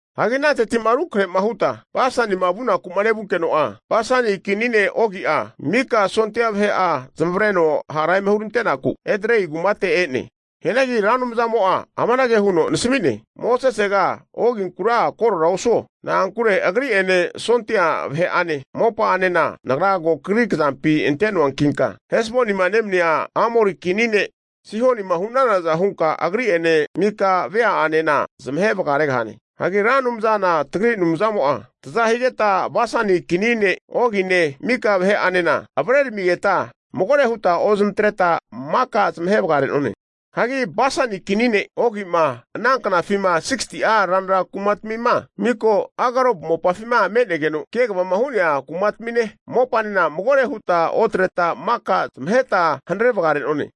Hagi ananteti'ma rukrahe'ma huta Basanima vunaku'ma nevunkeno'a, Basani kini ne' Ogi'a mika sondia vahe'a zamavreno hara eme hurante'naku Edrei kumate e'ne. Hianagi Ra Anumzamo'a amanage huno nasmi'ne, Mosesega, Oginkura korora osuo. Na'ankure agri'ene, sondia vahe'ane mopa'anena Nagra ko kagri kazampi ante'noankinka, Hesbonima nemania Amori kini ne' Sihonima hu'nanaza hunka, agri'ene mika vea'enena zamahe vagaregahane. Hagi Ra Anumzana tagri Anumzamo'a taza higeta Basani kini ne' Ogine mika vahe'anena avreramigeta magore huta ozmatreta, maka zamahe vagare'none. Hagi Basani kini ne' Ogi'ma ana knafima 60'a ranra kumatmima miko Argob mopafima me'negeno kegava hu'nea kumatamine mopanena magore huta otreta, maka zamaheta hanare vagare'none.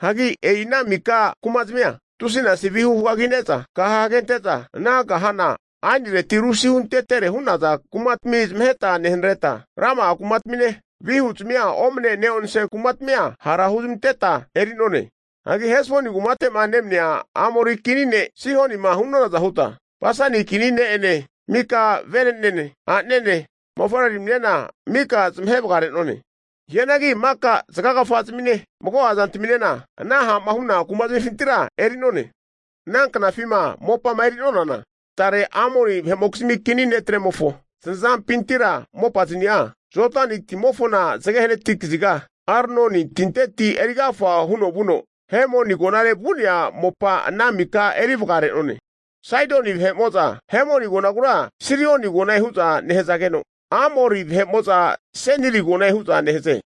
Hagi e'i ana mika kumazmia tusinasi vihu hugagine'za, kaha hagente'za ana kahana aenireti resihuntetere hu'naza kumatami zamaheta nehanareta, rama'a kumatamine, vihuzmia omane neonse kumazmia hara huzmanteta eri'none. Hagi Hesboni kumate'ma nemania Amori kini ne' Sihonima hu'nonaza huta, Basani kini ne'ene mika vene'nene, a'nanene mofavreramine mika zamahe vagare'none. Hianagi maka zagagafa zamine mago'a zantaminena ana ha'ma hu'na kumazmifintira eri'none. Ana knafima mopama eri'nonana, tare Amori vahe'mokizmi kini ne'tremofo zanazampintira mopaznia, Jodani timofona zage hanati kaziga Arnoni tinteti erigafa huno vuno, Hermoni agonare vu'nea mopa ana mika eri vagare'none. Saidoni vahe'mo'za Hermoni agonagura Sirioni agone hu'za nehazageno, Amori vahe'mo'za Seniri agone hu'za nehaze.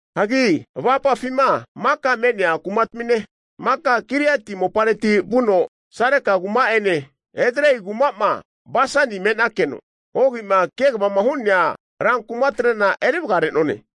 Hagi avapafima maka me'nea kumatamine, maka Giliati mopareti vuno Sareka kuma'ene Edrei kuma'ma Basani me'nakeno Ogi'ma kegavama hu'nea rankumatrena eri vagare'none.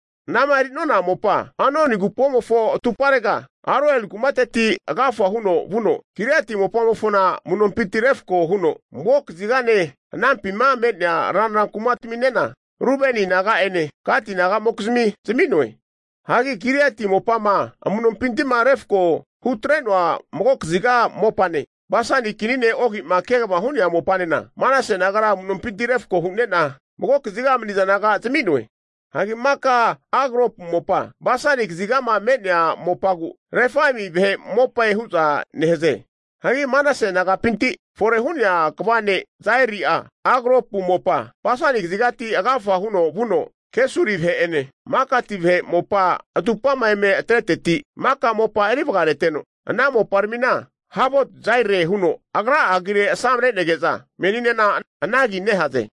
Ana'ma eri'nona mopa Arnoni agupomofo atumparega Aroeri kumateti agafa huno vuno, Giliati mopamofona amu'nompinti refko huno mago kazigane anampima me'nea ranra kumataminena, Rubeni naga'ene Gati nagamokizmi zami'noe. Hagi Giliati mopama amu'nompinti'ma refko hutre'noa mago kaziga mopane, Basani kini ne' Ogima kegavama hu'nea mopanena, Manase nagara amu'nompinti refko hu'ne'na, magokaziga maniza naga zami'noe. Hagi maka Argopu mopa Basani kaziga me'nea mopagu Refaimi vahe mopae hu'za nehaze. Hagi Manase nagapinti fore hu'nea kva ne' Jaeli'a Argopu mopa Basani kazigati agafa huno vuno, Kesuri vahe'ene Makati vahe mopa atupama eme atreteti maka mopa eri vagareteno, ana moparamina Havot Jaire huno agra'a agire asamre'nege'za meninena ana agi nehaze.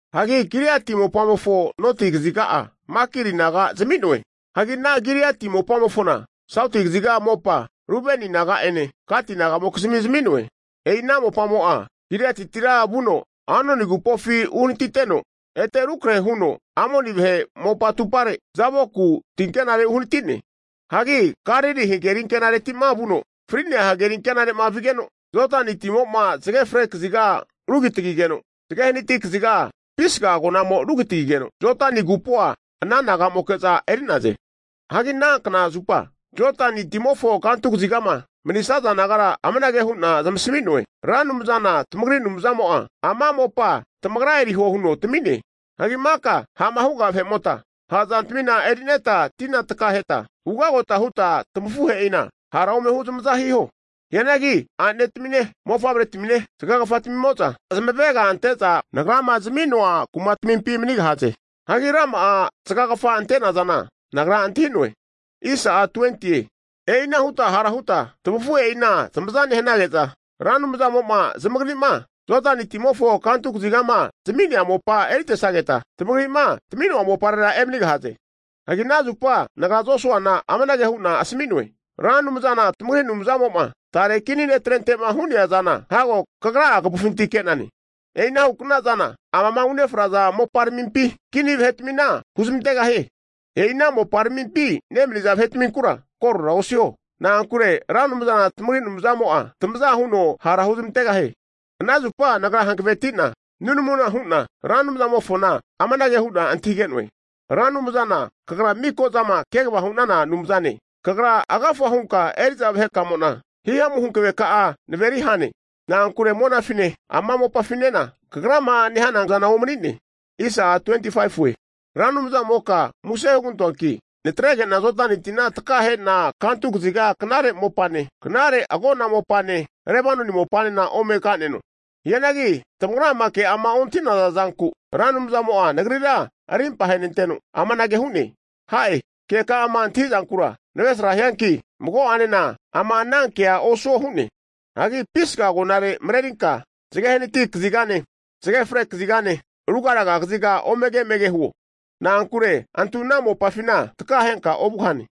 Hagi Giliati mopamofo noti kaziga'a Makiri naga zami'noe. Hagi ana Giliati mopamofona Sauti kaziga mopa Rubeni naga'ene, Gati nagamokizmi zami'noe. E'ina mopamo'a Giliatitira vuno Arnoni agupofi uhnatiteno, ete rukrahe huno Amoni vahe mopa atupare Jaboku tinkenare uhanati'ne. Hagi Galili hagerinkenati'ma vuno fri'nea hageri ankenare'ma vigeno, Jodani timo'ma zage fre kaziga rugitagigeno, zage hanati kaziga Pisga agonamo rugitagigeno, Jodani agupoa ana nagamoke'za eri'naze. Hagi anankna zupa Jodani timofo kantu kazigama manisaza nagara amanage hu'na zamasami'noe, Ra Anumzana tamagri Anumzamo'a ama mopa tamagra eriho huno tami'ne. Hagi maka ha'ma huga vahe'mota ha'zantamina eri'neta tina takaheta, ugagota huta tamafuhe'ina hara ome huzamaza hiho. Hianagi a'netamine, mofavretamine zagagafatamimo'za zamavega ante'za Nagrama zami'noa kumatamimpi manigahaze. (Hagi rama'a zagagafa ante'nazana nagra antahi'noe.) E'ina huta hara huta tamafuhe'ina zamaza nehanage'za, Ra Anumzamo'ma zamagri'ma Jodani timofo kantu kazigama zami'nea mopa eritesageta, tamagri'ma tami'noa moparera emanigahaze. Hagi ana zupa nagra Josuana amanage hu'na asami'noe, Ra Anumzana tamagri Anumzamo'ma tare kini ne'trente'ma hu'nea zana hago kagra'a kavufinti ke'nane. E'ina hu'kna'za amama unefraza moparamimpi kini vahetmina huzmantegahie. E'ina moparamimpi nemaniza vahetminkura korora osiho, na'ankure Ra Anumzana tamagri Anumzamo'a tamaza huno hara huzamantegahie. Ana zupa nagra hankaveti'na nunamuna hu'na Ra Anumzamofona amanage hu'na antahige'noe, Ra Anumzana kagra miko'zama kegavama hu'nana Anumzane, kagra agafa hunka eri'za vahe kamo'na himamu hankaveka'a naveri hane, na'ankure monafine ama mopafinena kagrama nehanankna zama huga anumzana omani'ne. Ra Anumzamoka muse hugantoanki, natrege'na Jodani tina takahe'na kantu kaziga knare mopane, knare agona mopane Lebanoni mopanena ome ka'neno. Hianagi tamagrama ke'ama ontahi'naza zanku, Ra Anumzamo'a nagrira arimpa ahenanteno amanage hu'ne, ha'e! Keka'ama antahi'zankura navresrahianki mago'anena ama anankea osuo hu'ne. Hagi Pisga agonare marerinka zage hanati kazigane, zage fre kazigane ruga raga kaziga omege emege huo. Na'ankure antu ana mopafina takahenka ovugahane.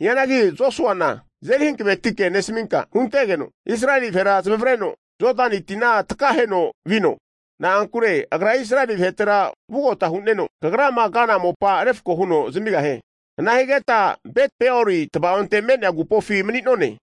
Hianagi Josuana azeri hankavetike nesaminka huntegeno, Israeli vahera zamavareno Jodani tina takaheno vino. Na'ankure agra Israeli vahetera vugota hu'neno, kagrama kana mopa refko huno zamigahie. Ana higeta Beti-Peori tavaonte me'nea agupofi mani'none.